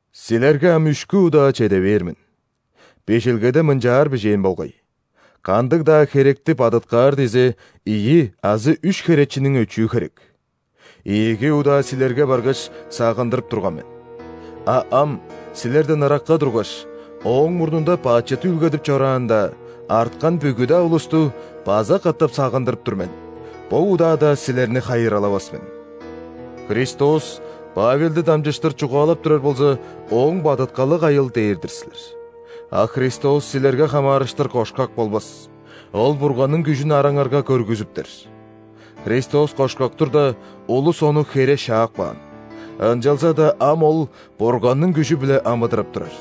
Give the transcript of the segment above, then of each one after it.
Силерге ам үшкү удаа чеде бээр мен. Бижилгеде мынчаар бижээн болгай: «Кандыг-даа херекти бадыткаар дизе, ийи азы үш херечиниң өчүү херек». Ийиги удаа силерге баргаш, сагындырып турган мен. А ам, силерден ыракка тургаш, ооң мурнунда бачыт үүлгедип чораан-даа, арткан бүгү-даа улусту база катап сагындырып тур мен: бо удаада силерни хайыралавас мен! «Христос Павелди дамчыштыр чугаалап турар болза, ооң бадыткалы кайыл?» – дээр-дир силер. А Христос силерге хамаарыштыр кошкак болбас, Ол Бурганның күжүн араңарга көргүзүптер! Христос кошкак турда, улус Ону хере шаап каан, ынчалза-даа ам Ол Бурганның күжү-биле амыдырап турар.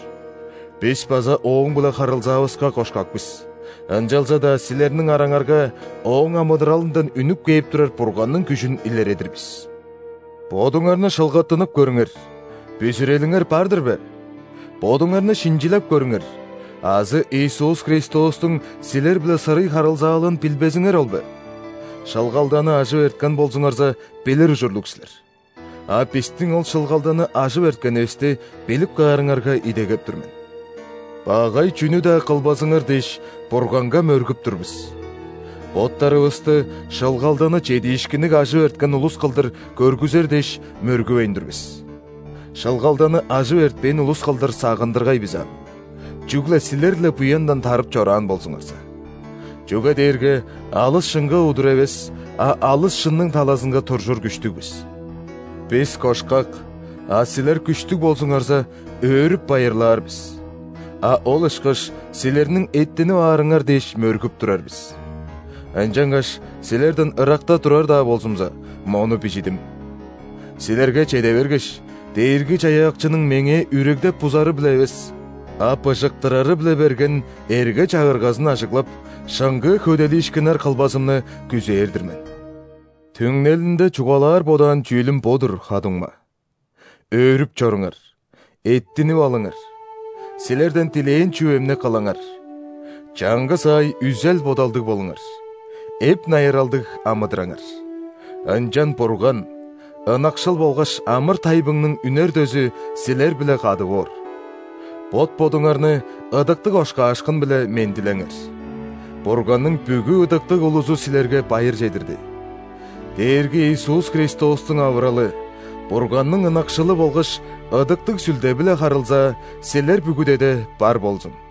Бис база Ооң-биле харылзаавыска кошкак бис, ынчалза-даа силерниң араңарга Ооң амыдыралындан үнүп кээп турар Бурганның күжүн илередир бис. Бодуңарны шылгаттынып көрүңер: бүзүрелиңер бар-дыр бе? Бодуңарны шинчилеп көрүңер! Азы Иисус Христостуң силер-биле сырый харылзаалыын билбезиңер ол бе? Шылгалданы ажып эрткен болзуңарза, билир ужурлуг силер. А бистиң ол шылгалданы ажып эрткенивисти билип каарыңарга идегеп тур мен. Багай чүнү-даа кылбазыңар дээш, Бурганга мөргүп тур бис. Боттарывысты шылгалданы чедиишкинниг ажып эрткен улус кылдыр көргүзер дээш, мөргүвейн тур бис. Шылгалданы ажып эртпээн улус кылдыр сагындыргай бис аан, чүгле силер-ле буяндан тарып чораан болзуңарза! Чүге дээрге алыс шынга удур эвес, а алыс шынның талазынга туржур күштүг бис. Бис кошкак, а силер күштүг болзуңарза, өөрүп-байырлаар бис, а ол ышкаш силерниң эттинип аарыңар дээш, мөргүп турар бис. Ынчангаш силерден ыракта турар-даа болзумза, мону бижидим. Силерге чеде бергеш, Дээрги-Чаяакчының меңээ үрегдеп-бузары-биле эвес, а быжыктырары-биле берген эрге-чагыргазын ажыглап, шыңгыы хөделиишкиннер кылбазымны күзээр-дир мен. Түңнелинде чугаалаар бодаан чүүлүм бо-дур, ха-дуңма: өөрүп чоруңар, эттинип алыңар, силерден дилээн чүвемни кылыңар, чаңгыс аай үзел-бодалдыг болуңар, эп-найыралдыг амыдыраңар. Ынчан Бурган, ынакшыл болгаш амыр-тайбыңның үнер дөзү, силер-биле кады боор! Бот-бодуңарны ыдыктыг ошкаашкын-биле мендилеңер. Бурганның бүгү ыдыктыг улузу силерге байыр чедирди. Дээрги Иисус Христостуң авыралы, Бурганның ынакшылы болгаш Ыдыктыг Сүлде-биле харылзаа силер бүгүдеде бар болзун!